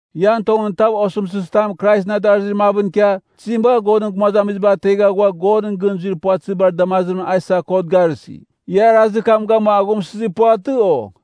Ian tongɨn tav osɨmtɨzitam Kraisɨn adarazir mavɨn ikia, tizim bagha Godɨn gumazamiziba ategha ghua Godɨn gɨn zuir puvatɨzibar damazimɨn a isa kot garɨsi? Ia arazir kam gamua aghumsɨzir puvatɨ, o?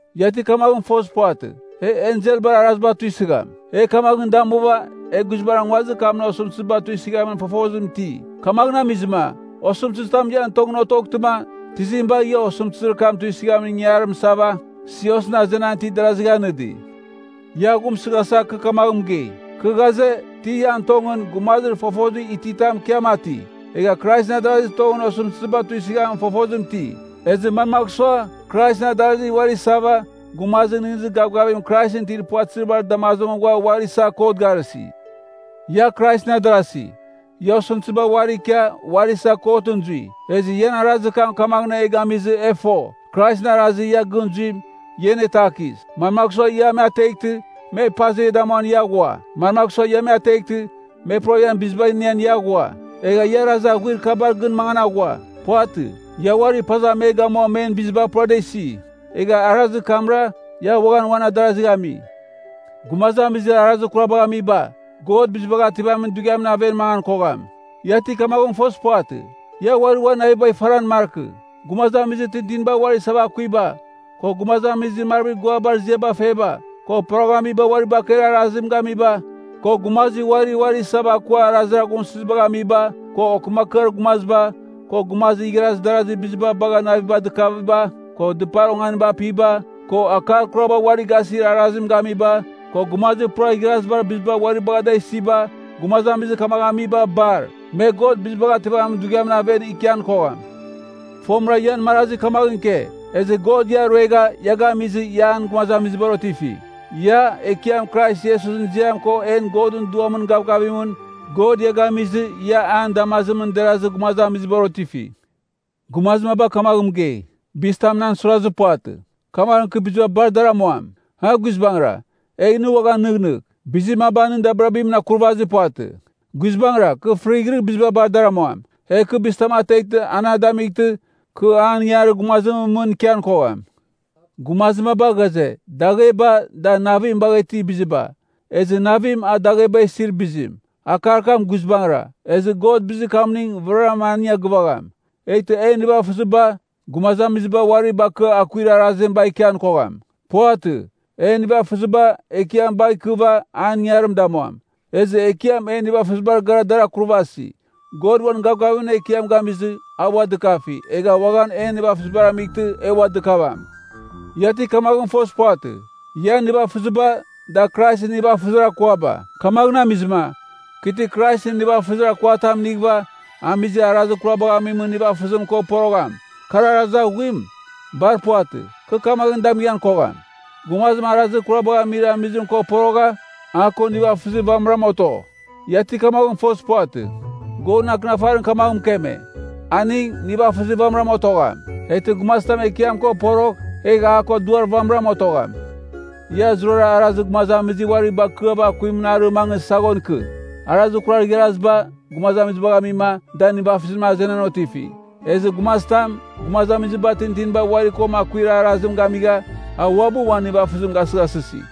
Ia ti kamaghɨn fozir puvatɨ? E enselbar araziba tuisɨgham. E kamaghɨn damuva, e guizbangɨra nguazir kamɨn osɨmtɨziba tuisɨghamin fofozim iti. Kamaghɨn amizɨma, osɨmtɨzitam ian tongɨn otoghtɨma, tizim bagh ia osɨmtɨzir kam tuisɨghamin ingangarim isava, siosɨn azenan itir darazigh anɨdi? Ia aghumsɨghasa, kɨ kamaghɨn mɨgei. Kɨ ghaze, ti ian tongɨn, gumazir fofozim ititam ikia mati, egha Kraisɨn adarazir tongɨn osɨmtɨziba tuisɨghamin fofozim iti. Ezɨ mamagh sua, Kraisɨn adarasi uari isava, gumazir nɨghnɨzir gavgavim Kraisɨn itir puvatɨzibar damazimɨn ghua uari isa kot garɨsi. Ia Kraisɨn adarasi, ia osɨmtɨziba uari ikia, uari isa kotɨn zui, ezɨ ian arazir kam kamaghɨn e gamizɨ e fo, Kraisɨn arazir ia gɨn zuim, ia anetakis. Manmagh sua ia me ateghtɨ, me paza ia damuan ia aghua? Manmagh sua ia me ateghtɨ, me pura ian biziba inian ia aghua? Egha ia arazir aghuir kabar gɨn mangan aghua. Puvatɨ. Ia uari paza me gamua men biziba pura da isi. Egha arazir kamra, ia uaghan uan adarazigh ami. Gumazamizir arazir kurabagh amiba, God Bizibagh Ativamin Dughiamɨn aven mangan kogham. Ia ti kamaghɨn fozir puvatɨ? Ia uari uan navibagh ifaran markɨ. Gumazamizir tintinibar uari isava akuiba, ko gumazamizir marvir guabar ziaba feba, ko poroghamiba uari bakeir arazim gamiba, ko gumazir uarira uari isa akua arazir aghumsɨzibagh amiba, ko okɨmakɨar gumaziba, ko gumazir igharaz darazir biziba bagha navim dɨkaviba, ko dɨpar onganiba apiba, ko akar kuraba uari gasir arazim gamiba, ko gumazir pura igharazibar biziba uari bagha da isiba, gumazamizir kamaghɨn amiba bar, me God Bizibagh Ativamin Dughiamɨn aven ikian kogham. Fomɨra ian marazi kamaghɨn ike. Ezɨ God ia ruegha, ia gamizɨ, ia an gumazamizibar otifi. Ia, Ekiam Krais Iesusɨn ziam ko en Godɨn Duamɨn gavgavimɨn, God ia gamizɨ, ia an damazimɨn derazir gumazamizibar otifi. Gumazir maba kamaghɨn mɨgei, “Bizitam nan suirazir puvatɨ, kamaghɨn kɨ biziba bar dar amuam.” A Guizbangɨra, egh nɨ uaghan nɨghnɨgh, bizir maba nɨn dabirabimɨn akurvazir puvatɨ. Guizbangɨra, kɨ fɨrighɨrɨ biziba bar dar amuam. Egh kɨ bizitam ateghtɨ a na damightɨ, kɨ an ingangarir gumazimɨn mɨn ikian kogham. Gumazir maba ghaze, “Dagheba, da navim bagha itir biziba, ezɨ navim, a dagheba isir bizim.” Akar kam guizbangɨra, ezɨ God bizir kamning vɨraram aning a gɨvagham. Eghtɨ en nivafɨziba, gumazamiziba uari bakɨa akuir arazim bagh ikian kogham. Puvatɨ. En nivafɨziba, Ekiam bagh ikɨva, an ingangarim damuam. Ezɨ Ekiam en nivafɨzibar gara dar akurvasi. God uan gavgavimɨn Ekiam gamizɨ, a ua dɨkafi, egh uaghan en nivafɨzibar amightɨ e ua dɨkavam. Ia ti kamaghɨn fozir puvatɨ? Ian nivafɨziba, da Kraisɨn nivafɨzir akuaba. Kamaghɨn amizɨma, kɨ ti Kraisɨn nivafɨzir akua tam inighɨva, amizir arazir kurabagh amimɨn nivafɨzim ko porogham, kar arazir aghuim? Bar puvatɨ! Kɨ kamaghɨn damighan kogham! Gumazim arazir kurabagh amir amizim ko porogha, a ko aning nivafɨzir vamɨram oto. Ia ti kamaghɨn fozir puvatɨ? Godɨn Akɨnafarim kamaghɨn mɨkeme, “Aning, nivafɨzir vamɨram otogham.” Eghtɨ gumazitam Ekiam ko porogh, egh a ko Duar vamɨram otogham. Ia zurara arazir gumazamizir uari bakɨava akuimɨn arɨ mangɨ, an saghon ikɨ. Arazir kurar igharaziba, gumaziba dagh amima, da nivafɨzimɨn azenan otifi. Ezɨ gumazitam, gumazamiziba tintinibar uari ko akuir arazim gamigha, a uabɨ uan nivafɨzim gasɨghasɨsi.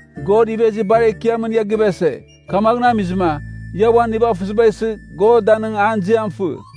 God ivezir bar ekiamɨn ia givese. Kamaghɨn amizɨma, ia uan nivafɨziba isɨ, God danɨng an ziam fɨ.